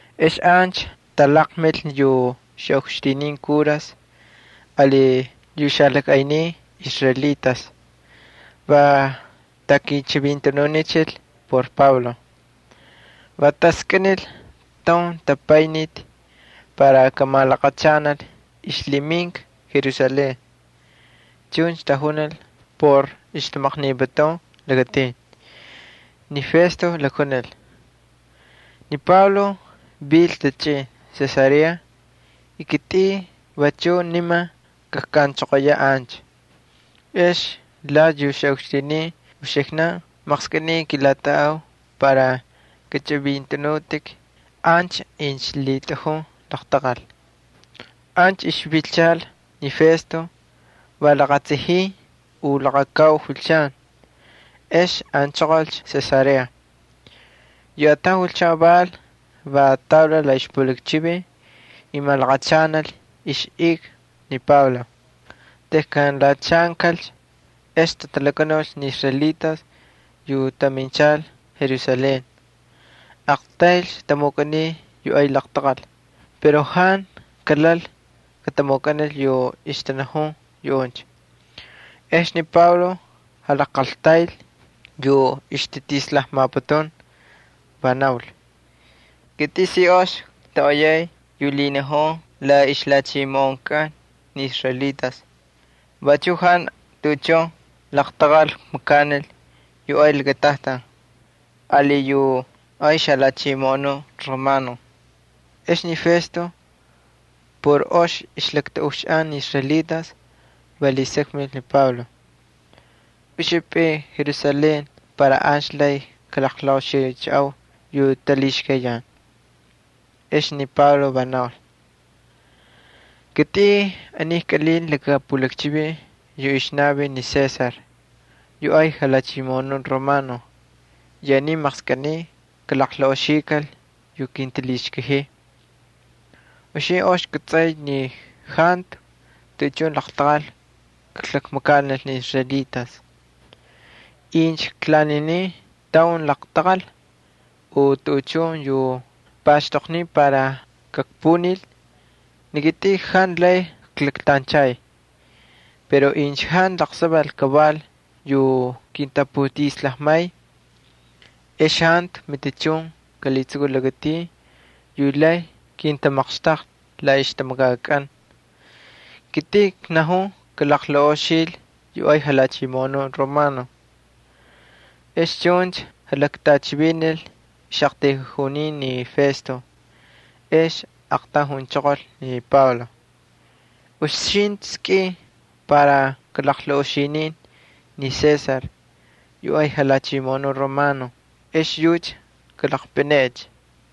Ex ancha talaqmil yu xaꞌukxtinin kuras ali yu xalajꞌaynin israelitas va takichivintanunichil por Pablo. Va taskꞌinil taun jatapayniti para kamalaqachanal ixlhiminka Jerusalén. Chuncha tajunil por ixtamaqniputun lakatin. Ni Festo lakjunil: —Ni Pablo vil tachꞌin Cesarea y kitꞌin vachuꞌ niman kajkꞌanchoqoyaꞌ ancha. Ex lati yu xaꞌukxtinin uxiknan maqskꞌiniy kilatꞌaꞌau para kachꞌivintꞌanutꞌik ancha incha lhitꞌajun laqtaqal. Ancha ixvilchal ni Festo va laqatsajin u laqakau julchan, ex anchoqolcha Cesarea. Yu ataun julchan val, va taulal la ixpulakchivin y malaqachanal ixꞌika ni Pablo. Tejkan lhachaankalcha ex tatalakanulcha ni israelitas yu taminchal Jerusalén. Aqtaylcha tamukꞌaniy yu ay laqtaqal pero jantu kalal katamukꞌanil yu ixtanajun yuꞌuncha. Ex ni Pablo jalajqaltayl yu ixtatislajmaputun, va naul: —Kitꞌin si ox ktoꞌoyay yu lhinajun la ixlhachimoꞌonkꞌan ni israelitas, vachuꞌ jantu tuꞌuchun laqtaqal kmakanil yu ay lakatajtan ali yu ay xajalhachimoꞌonuꞌ Romano. Ex ni Festo por ox ixlaktꞌaꞌuxaꞌan ni israelitas va lhisakmil ni Pablo: —¿Uxapꞌin Jerusalén para ancha lay kalaqlaꞌoxichaꞌau yu talhixkayan? Ex ni Pablo va naul: —Kitꞌin aniycha kꞌalinta laka pulakchivin yu ixnavin ni César yu ay jalhachimoꞌonuꞌ romano y aniy maqskꞌiniy kalaqlaꞌoxikal yu kintalhixkajiy. Uxintꞌi ox kꞌatsꞌay ni jantu tuꞌuchun laqtaqal kaklakmakanil ni israelitas. Incha klaninin taun laqtaqal u tuꞌuchun yu paxtoqniy para kakpunil, ni kitꞌin jantu lay klaktanchay. Pero incha jantu laqsaval kaval yu kintaputislajmay ex jantu matichun kalhitsukul lakatin yu lay kintamaqxtaqlhi la ixtamakakꞌan. Kitꞌin knajun kalaqlaꞌoxil yu ay jalhachimoꞌonuꞌ Romano. Ex chuncha jalaktꞌachivinil ixꞌaqtayjunin ni Festo, ex aqtaun junchoqol ni Pablo: —Uxintꞌi skꞌin para kalaqlaꞌoxinin ni César yu ay jalhachimoꞌonuꞌ romano ex yucha kalaqpꞌineꞌecha.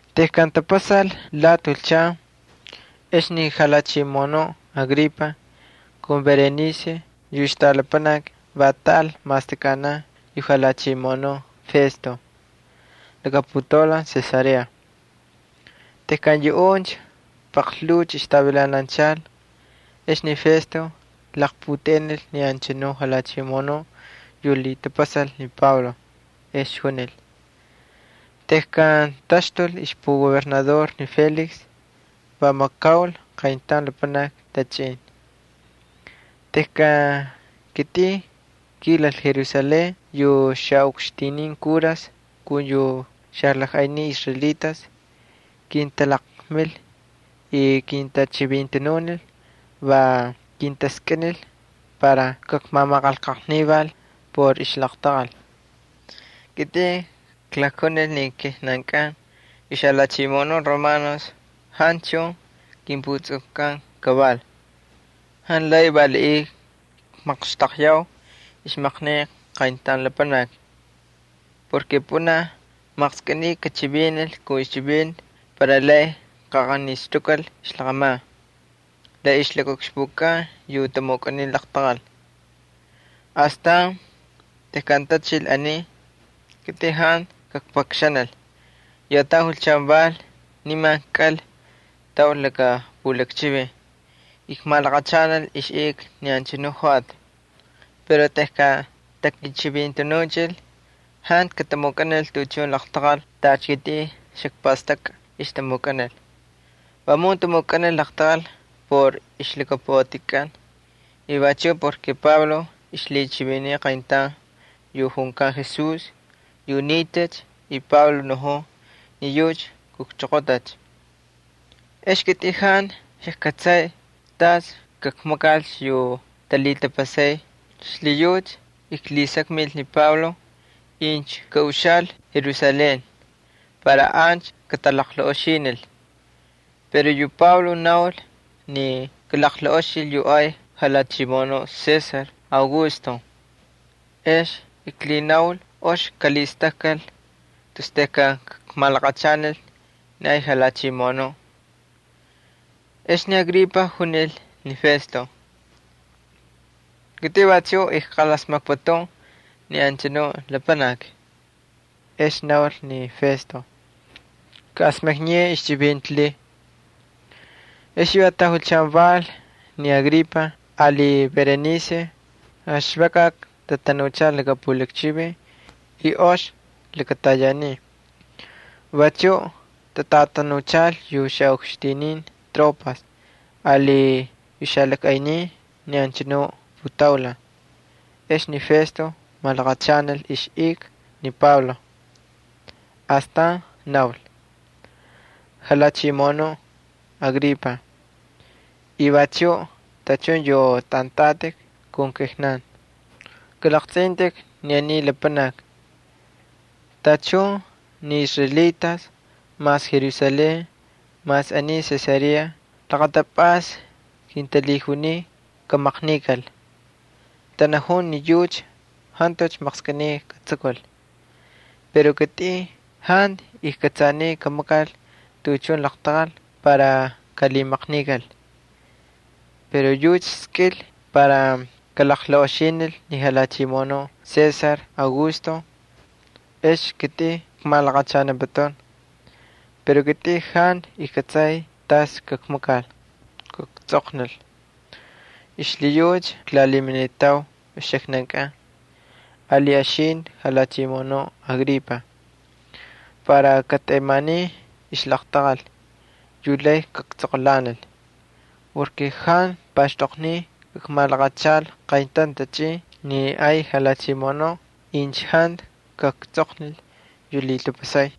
Tejkan tapasal lati julchan, ex ni jalhachimoꞌonuꞌ Agripa kun Berenice yu ixtꞌalapanaki va taꞌal mastakꞌanan yu jalhachimoꞌonuꞌ Festo laka putaulan Cesarea. Tejkan yuꞌuncha paqlhuucha ixtavilananchal, ex ni Festo laqputeꞌenil ni anchanu jalhachimoꞌonuꞌ yu lhitapasal ni Pablo, va junil: —Tejkan taxtul ixpugobernador ni Félix va makaul qayntaun lapanaki tachꞌin. Tejkan kitꞌin kilal Jerusalén yu xaꞌukxtinin kuras kun yu xalajꞌaynin israelitas kintalaqmil y kintachivintanunil, va kintaskꞌinil para kakmamaqanlqajnival por ixlaqtaqal. Kitꞌin klakjunil ni kijnankꞌan yu xalhachimoꞌonun Romanos jantu chun kimputsukkꞌan kaval. Jantu lay valiꞌiy kmaqxtaqyau ixmaqnika qayntaun lapanaki. Pꞌunaj maqskꞌiniy kachivinil kun ixchivinti para lay kaꞌaqanixtukal ixlaqꞌaman la ixlakaꞌukxpukꞌan yu tamukꞌaniy laqtaqal. Astan tejkan tachil aniy, kitꞌin jantu kakpakxanil. Yu ataun julchan val, nimancha kꞌal taul laka pulakchivin y kmalaqachanal ixꞌika ni anchanu joꞌati. Pero tejkan takichivintanuchil jantu katamukꞌanil tuꞌuchun laqtaqal tacha kitꞌin xakpastakꞌa ixtamukꞌanil. Vamun tamukꞌanil laqtaqal por ixlhakapuꞌatikꞌan y vachuꞌ porke Pablo ixlhichiviniy qayntaun yu junkan Jesús yu nitacha y Pablo najun ni yucha kujchoqotacha. Ex ni kitꞌin jantu xajkꞌatsay tas kakmakalcha yu talhitapasay xlhiyucha klhisakmil ni Pablo incha kaꞌuxaꞌal Jerusalén para ancha katalaqlaꞌoxinil. Pero yu Pablo naul ni kalaqlaꞌoxil yu ay jalhachimoꞌonuꞌ Augusto. Ex klhinaul ox kalhistakkal tus tejkan kakmalaqachanil ni ay jalhachimoꞌonuꞌ. Ex ni Agripa junil ni Festo: —Kitꞌin vachuꞌ ijqalasmakputun ni anchanu lapanaki. Ex naul ni Festo: —Kaꞌasmakniyeꞌe ixchivinti lhiy. Ex yu ataun julchan val ni Agripa ali Berenice va xvakꞌakꞌa tatanuchal laka pulakchivin. Ox lakatayanin. Vachuꞌ tatꞌatanuchal yu xaꞌukxtinin tropas ali yu xalajꞌaynin ni anchanu putaulan. Ex ni Festo malaqachanal ixꞌika ni Pablo, y astan naul: —Jalhachimoꞌonuꞌ Agripa, y vachuꞌ tachun yu tꞌantꞌatꞌik kun kijnan, kalaqtsꞌintꞌik ni aniy lapanaki. Tachun ni israelitas mas Jerusalén mas aniy Cesarea laqatapꞌasta kintalhijuniy kamaqnikal, tanajun ni yucha jantucha maqskꞌiniy katsukul. Pero kitꞌin jantu ijkꞌatsaniy kamakal tuꞌuchun laqtaqal para kalhimaqnikal. Pero yucha skꞌil para kalaqlaꞌoxinil ni jalhachimoꞌonuꞌ Augusto, ex kitꞌin kmalaqachaniputun. Pero kitꞌin jantu ijkꞌatsay tas kakmakal kaktsꞌoqnil. Xlhiyucha klalhiminitau uxiknankꞌan, ali uxintꞌi, jalhachimoꞌonuꞌ Agripa, para katꞌemanin ixlaqtaqal yu lay kaktsꞌoqꞌulanil. Jantu paxtoqniy kakmalaqachal qayntaun tachꞌin ni ay jalhachimoꞌonuꞌ incha jantu kaktsꞌoqnil yu lhitapasay.